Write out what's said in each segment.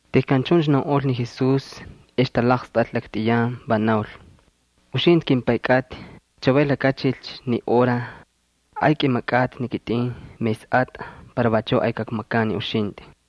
Tejkan chuncha naunꞌol ni Jesús ex talaqstꞌal laktꞌiyan, va naul: —Uxintꞌi, kimPay kꞌatꞌi, chavay lakachilcha ni hora. Ay kꞌimakꞌatꞌi ni kitꞌin mesꞌatꞌa para vachuꞌ ay kakmakan ni uxintꞌi.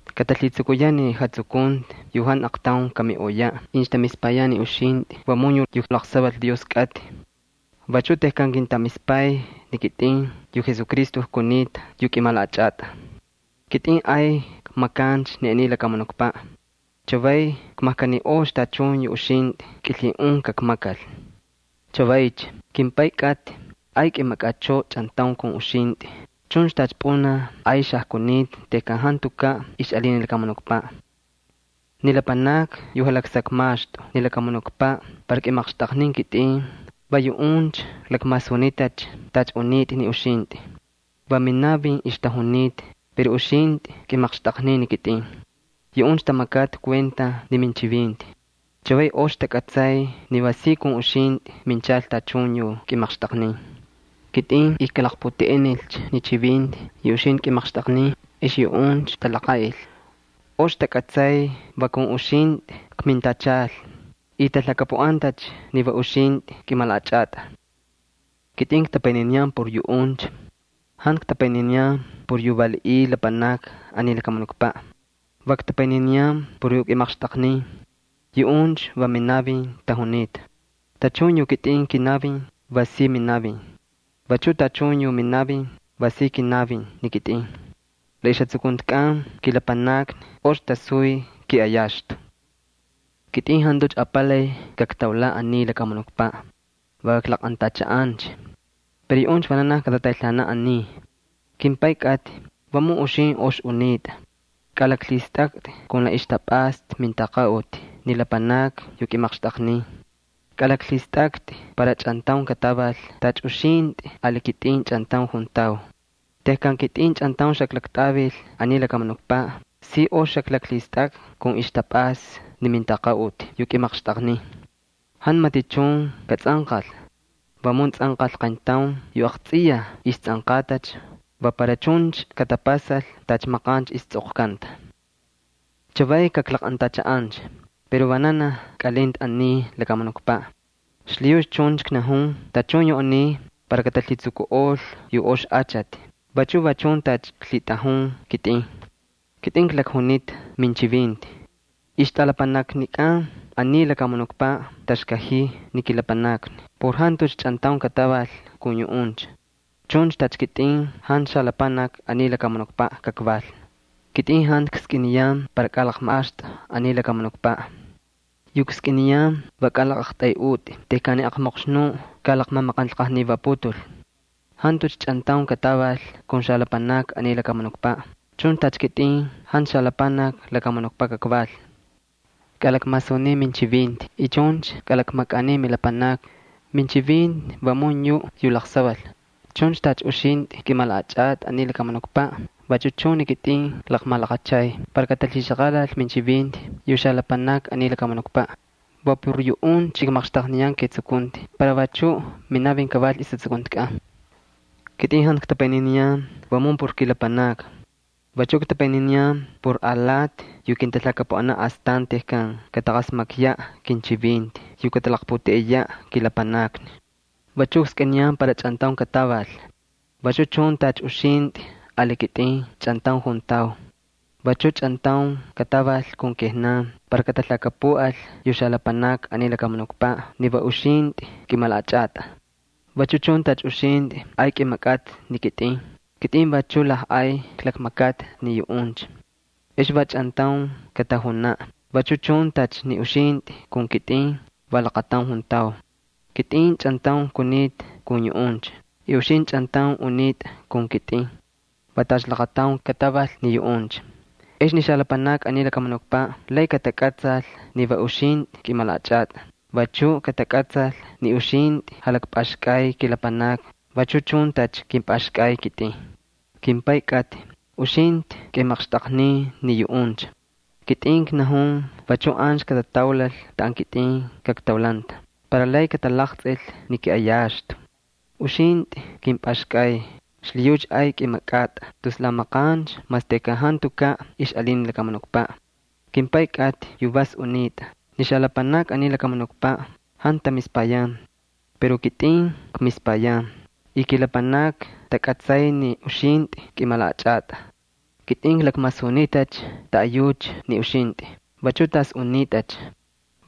Katalhitsukuyaꞌ ni jatsukunti yu jantu aqtaun kamiꞌoyaꞌ incha tamispayan ni uxintꞌi vamun yuꞌ yu laqsaval Dios kꞌatꞌi. Vachu tejkan kintamispay ni kitꞌin yu Jesucristo kunita yu kꞌimalaꞌachꞌatꞌa. ’Kitꞌin ay kmakancha ni aniy lakamunukpaꞌ, chavay kmajkaniꞌolcha tachun yu uxintꞌi kꞌilhiꞌun kakmakal. Chavaycha, kimPay kꞌatꞌi, ay kꞌimakꞌachꞌoꞌo chꞌantaun kun uxintꞌi chuncha tacha pꞌunaj ay xajkunita tejkan jantukaꞌ ixꞌalin ni lakamunukpaꞌ. ’Ni lapanakni yu jalaksakmaxtꞌu ni lakamunukpaꞌ para kꞌimaqxtꞌaqnin kitꞌin, va yuꞌuncha klakmasunitacha tacha unitꞌa ni uxintꞌi. Va minavin ixtajunita pero uxintꞌi kꞌimaqxtꞌaqnin ni kitꞌin. Yuꞌuncha tamakata kuenta ni minchivinti. Chavay ox takꞌatsay ni va si kun uxintꞌi minchal tachun yu kꞌimaqxtꞌaqnin. Kitꞌin ijkalaqputeꞌenilcha ni chivinti yu uxintꞌi kꞌimaqxtꞌaqnin, ex yuꞌuncha talaqaꞌil. Ox takꞌatsay va kun uxintꞌi kmintachal y talhakapuꞌantacha ni va uxintꞌi kꞌimalaꞌachꞌatꞌa. ’Kitꞌin ktapayniniyan por yuꞌuncha. Jantu ktapayniniyan por yu valiꞌiy lapanakni aniy lakamunukpaꞌ. Va ktapayniniyan por yu kꞌimaqxtꞌaqnin, yuꞌuncha va minavin tajunita. Tachun yu kitꞌin kinavin va si minavin. Vachuꞌ tachun yu minavin va si kinavin ni kitꞌin. La ixjatsukuntikꞌan kilapanakni ox tasuy kiꞌayaxtu. ’Kitꞌin jantucha apalay kaktaulaꞌ aniy lakamunukpaꞌ, va klaqꞌantachaꞌancha. Pero yuꞌuncha vananaj katataylhaanaꞌ aniy. KimPay kꞌatꞌi, vamun uxintꞌi ox unitꞌa, kꞌalaklhistꞌaktꞌi kun la ixtapꞌasta mintaqaꞌuti ni lapanakni yu kꞌimaqxtꞌaqnin. Kalaklhistꞌaktꞌi para chꞌantaun kataval tacha uxintꞌi ali kitꞌin chꞌantaun juntau. Tejkan kitꞌin chꞌantaun xaklaktꞌavil aniy lakamunukpaꞌ si ox xaklaklhistakꞌa kun ixtapꞌasta ni mintaqaꞌuti yu kꞌimaqxtꞌaqnin. Jantu matichun katsꞌanqal, vamun tsꞌanqal qayntaun yu aqtsꞌiyaj istsꞌanqatacha, va para chuncha katapasal tacha maqancha istsꞌoqkanta. ’Chavay kaklaqꞌantachaꞌancha. Pero vananaj kꞌalinta aniy lakamunukpaꞌ, xlhiyucha chuncha knajun tachun yu aniy para katalhitsukuꞌol yu ox achati vachu va chun tacha klhitꞌajun ni kitꞌin. Kitꞌin klakjunita minchivinti. Ixtꞌalapanaknikꞌan aniy lakamunukpaꞌ taxkajiy ni kilapanakni por jantucha chꞌantaun kataval kun yuꞌuncha. Chuncha tacha kitꞌin jantu xalapanaki aniy lakamunukpaꞌ kakval. Kitꞌin jantu kskꞌiniyan para kꞌalakmaxtꞌu aniy lakamunukpaꞌ. Yu kskꞌiniyan va kꞌalaqꞌaqtꞌayꞌutꞌi tejkan ni aqmoqxnuꞌ kalaqmamaqanlqajnivaputul. Jantucha chꞌantaun kataval kun xalapanakni aniy lakamunukpaꞌ, chuncha tacha kitꞌin jantu xalapanakni lakamunukpaꞌ kakval. Kꞌalakmasunin minchivinti y chuncha kꞌalakmakꞌanin milapanakni. Minchivinti vamun yuꞌ yu laqsaval. Chuncha tacha uxintꞌi kꞌimalaꞌachꞌatꞌi aniy lakamunukpaꞌ vachu chun ni kitꞌin klaqmalaqachay para katalhixaqalal minchivinti yu xalapanakni aniy lakamunukpaꞌ. Va por yuꞌuncha kmaqxtaqniyan ketsukunti para vachuꞌ minavin kaval ixjatsukuntikꞌan. ’Kitꞌin jantu ktapayniniyan vamun por kilapanakni. Vachu ktapayniniyan por alati yu kintalhakapuꞌanaꞌ astan tejkan kataqasmakyaꞌ kinchivinti yu katalaqputeꞌeyaꞌ kilapanakni. Vachu kskꞌiniyan para chꞌantaun kataval. Vachu chun tacha uxintꞌi ali kitꞌin chꞌantaun juntau. Vachuꞌ chꞌantaun kataval kun kijnan para katalhakapuꞌal yu xalapanakni aniy lakamunukpaꞌ ni va uxintꞌi kꞌimalaꞌachꞌatꞌa. Vachu chun tacha uxintꞌi ay kꞌimakꞌatꞌa ni kitꞌin, kitꞌin vachuꞌ lajꞌay klakmakata ni yuꞌuncha. Ex va chꞌantaun katajunaꞌ, vachu chun tacha ni uxintꞌi kun kitꞌin va laqataun juntau. Kitꞌin chꞌantaun kunita kun yuꞌuncha y uxintꞌi chꞌantaun unitꞌa kun kitꞌin. Va tacha laqataun kataval ni yuꞌuncha. Ex ni xalapanakni aniy lakamunukpaꞌ lay katakꞌatsal ni va uxintꞌi kꞌimalaꞌachꞌatꞌa, vachu katakꞌatsal ni uxintꞌi jalakpꞌaxkꞌay kilapanakni vachu chun tacha kꞌimpꞌaxkꞌay ni kitꞌin. ’KimPay kꞌatꞌi, uxintꞌi kꞌimaqxtꞌaqnin ni yuꞌuncha. Kitꞌin knajun vachuꞌ ancha katataulal taꞌan kitꞌin kaktaulanta para lay katalaqtsꞌil ni kiꞌayaxtu. Uxintꞌi kꞌimpꞌaxkꞌay, xlhiyucha ay kꞌimakꞌatꞌa tus la maqancha mas tejkan jantukaꞌ ixꞌalin ni lakamunukpaꞌ. KimPay kꞌatꞌi yu vas unitꞌa, ni xalapanakni aniy lakamunukpaꞌ jantu tamispayan. Pero kitꞌin kmispayan y kilapanakni takꞌatsay ni uxintꞌi kꞌimalaꞌachꞌatꞌa. Kitꞌin klakmasunitacha taꞌayucha ni uxintꞌi, vachuꞌ tas unitꞌacha.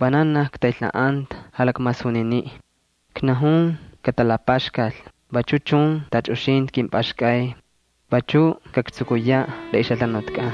Vananaj ktaylhaꞌanta jalakmasuniniꞌ. Knajun katalapaxkal vachu chun tacha uxintꞌi kꞌimpꞌaxkꞌay. Vachu kaktsukuyaꞌ la ixjalhanutkꞌan.